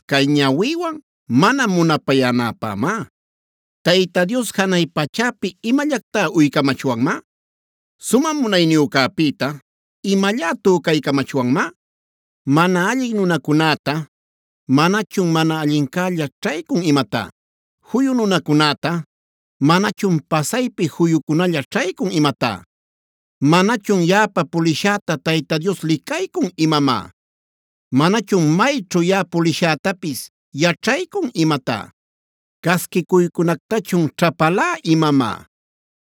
cay ñawïwan mana munapayänäpämá. ¿Tayta Dios janay pachäpi imallactá uycamachwanmá? ¿Sumä Munayniyücäpïta imallá tücaycamachwanmá? ¿Mana allin nunacunätá, manachun mana allincälla ćhaycun imatá? ¿Juyu nunacunätá, manachun pasaypi juyucunalla ćhaycun imatá? ¿Manachun yaꞌapa pulishäta Tayta Dios licaycun imamá? ¿Manachun mayćhu yaꞌa pulishätapis yaćhaycun imatá? “¿Casquicuycunactachun ćhapalá imamá?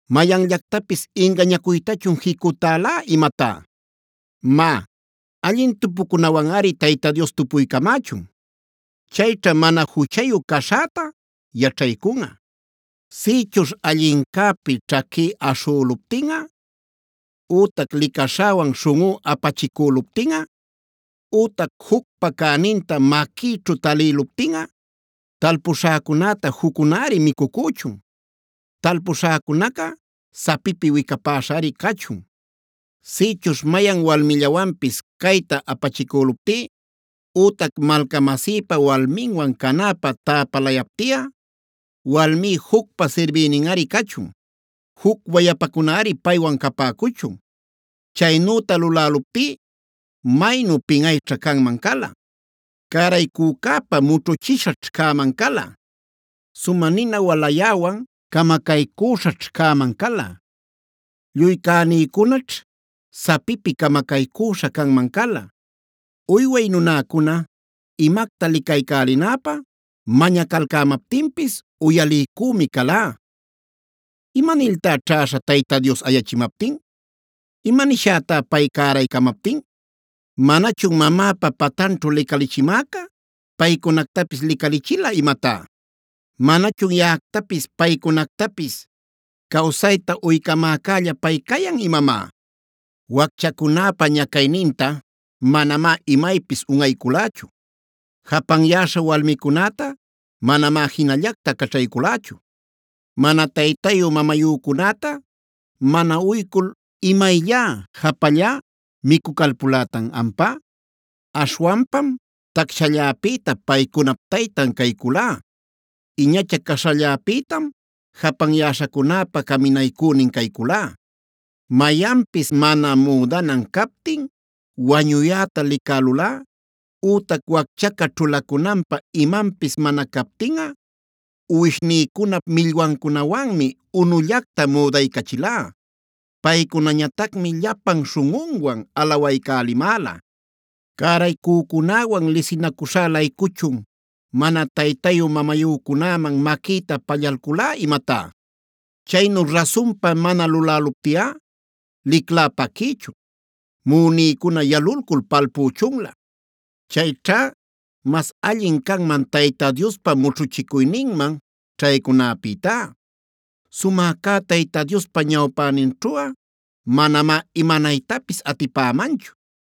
¿Mayanllactapis ingañacuytachun jicutälá imatá? Má, allin tupucunawanꞌari Tayta Dios tupuycamächun; chayćha mana juchayu caśhäta yaćhaycunꞌa. Sïchuśh allincäpi ćhaquí aśhüluptinꞌa ütac licaśhäwan śhunꞌú apachicüluptinꞌa ütac jucpa cäninta maquïćhu talïluptinꞌa, talpuśhäcunäta juccunari micucüchun, talpuśhäcunaca sapipi wicapäśhari cachun. “Sïchuśh mayan walmillawanpis cayta apachicüluptí ütac malcamasïpa walminwan canäpä täpalayaptiꞌa, walmí jucpa sirbïninꞌari cachun; juc wayapacunari paywan capäcuchun. Chaynüta luläluptí maynu pinꞌayćha canman cala; cäraycücäpa mućhuchiśhaćh cäman cala. Sumä nina walayäwan camacaycüśhaćh cäman cala; lluy cänïcunaćh sapipi camacaycüśha canman cala. “Uyway nunäcuna imacta licaycälinäpä mañacalcämaptinpis uyaliycümi calá. ¿Imaniltá ćhäśha Tayta Dios ayachimaptin? ¿Imanishätá pay cäraycamaptin? ¿Manachun mamäpa patanćhu licalichimäca paycunactapis licalichila imatá? ¿Manachun yaꞌactapis paycunactapis cawsayta uycamäcälla pay cayan imamá? “Wacchacunäpa mañacuyninta manamá imaypis unꞌayculächu; japanyäśha walmicunäta manamá jinallacta caćhayculächu. ¿Mana taytayu-mamayücunäta mana uycul imayllá japallá micucalpulätan ampá? Aśhwanpam tacshalläpïta paycunap taytan cayculá; iñacha caśhalläpïtam japanyäśhacunäpa caminaycünin cayculá. Mayanpis mana müdanan captin wañuyäta licälulꞌa ütac wacchaca ćhulacunanpä imanpis mana captinꞌa, uwishnïcunap millwancunawanmi unullacta müdaycachilá; paycunañatacmi llapan śhunꞌunwan alawaycälimäla. ¿Cäraycücunäwan lisinacuśhá-laycuchun mana taytayu-mamayücunäman maquïta pallalculá imatá? Chaynu rasunpa mana lulaptiꞌa liclá paquïchun; muꞌunïcuna yalulcul palpüchunlä. Chayćha mas allin canman Tayta Diospa mućhuchicuyninman ćhaycunäpïtá. Sumä cä Tayta Diospa ñawpäninćhuꞌa manamá imanaytapis atipämanchu.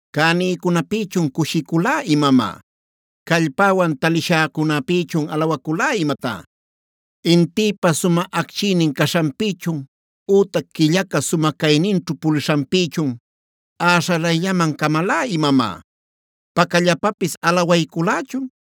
¿Cänïcunapïchun cushiculá imamá? ¿Callpäwan talishäcunapïchun alawaculá imatá? ¿Intïpa sumä acchiynin caśhanpïchun ütac quillaca sumä cayninćhu pulishanpïchun äśhalayllaman camalá imamá? ¿Pacallapapis alawayculächun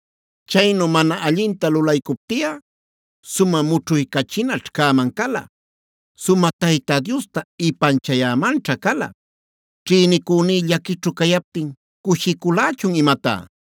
Chaynu mana allinta lulaycuptiꞌa sumä mućhuycachinaćh cäman cala; sumä Tayta Diosta ipanchayämanćha cala. “¿Ćhïnicüní llaquićhu cayaptin cushiculächun imatá?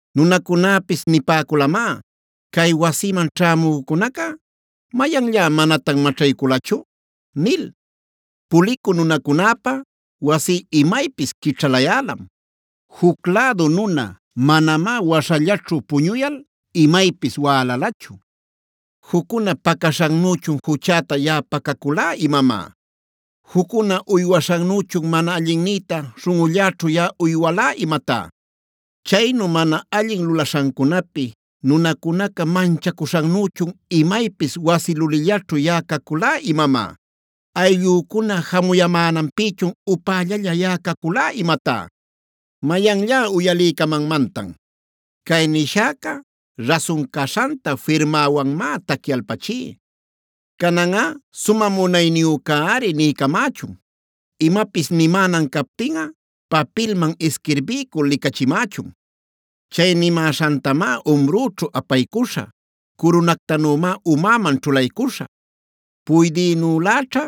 Nunäcunapis nipäculamá: ‘¿Cay wasiman ćhämücunaca mayanllá manatan maćhayculachu?’ nil. Pulicü nunacunäpä wasí imaypis quićhalayälam; juc lädu nuna manamá waśhallaćhu puñuyal imaypis wälalachu. “¿Juccuna pacaśhannüchun juchäta yaꞌa pacaculá imamá? ¿Juccuna uywaśhannüchun mana allinnïta śhunꞌulläćhu yaꞌa uywalá imatá? ¿Chaynu mana allin lulaśhancunapi nunacunaca manchacuśhannüchun imaypis wasi lulillaćhu yaꞌa caculá imamá? ¿Ayllücuna jamuyamänanpïchun upällalla yaꞌa caculá imatá? ¡Mayanllá uyaliycamanmantan! Cay nishäca rasun caśhanta firmäwanmá tacyalpachí. Cananꞌa Sumä Munayniyücäri niycamächun; imapis nimänan captinꞌa papilman isquirbiycul licachimächun. Chay nimäśhantamá umrüćhu apaycuśhä; curunactanümá umäman ćhulaycuśhä. Puydïnüläćha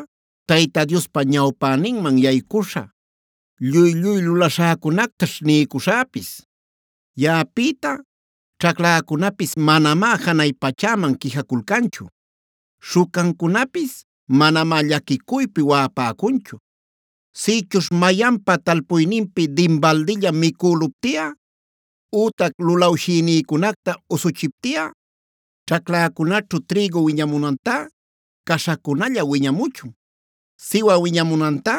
Tayta Diospa ñawpäninman yaycuśhä; lluy-lluy lulaśhäcunactaćh niycuśhäpis. “Yaꞌapïta ćhacläcunapis manamá janay pachäman quijaculcanchu; śhucancunapis manamá llaquicuypi waꞌapäcunchu. Sïchuśh mayanpa talpuyninpi dinbaldilla micüluptiꞌa ütac lulawshïnïcunacta usuchiptiꞌa, ćhacläcunaćhu trïgu wiñamunantá, caśhacunalla wiñamuchun; siwä wiñamunantá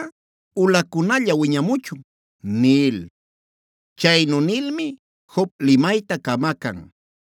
ulacunalla wiñamuchun” nil. Chaynu nilmi Job limayta camacan.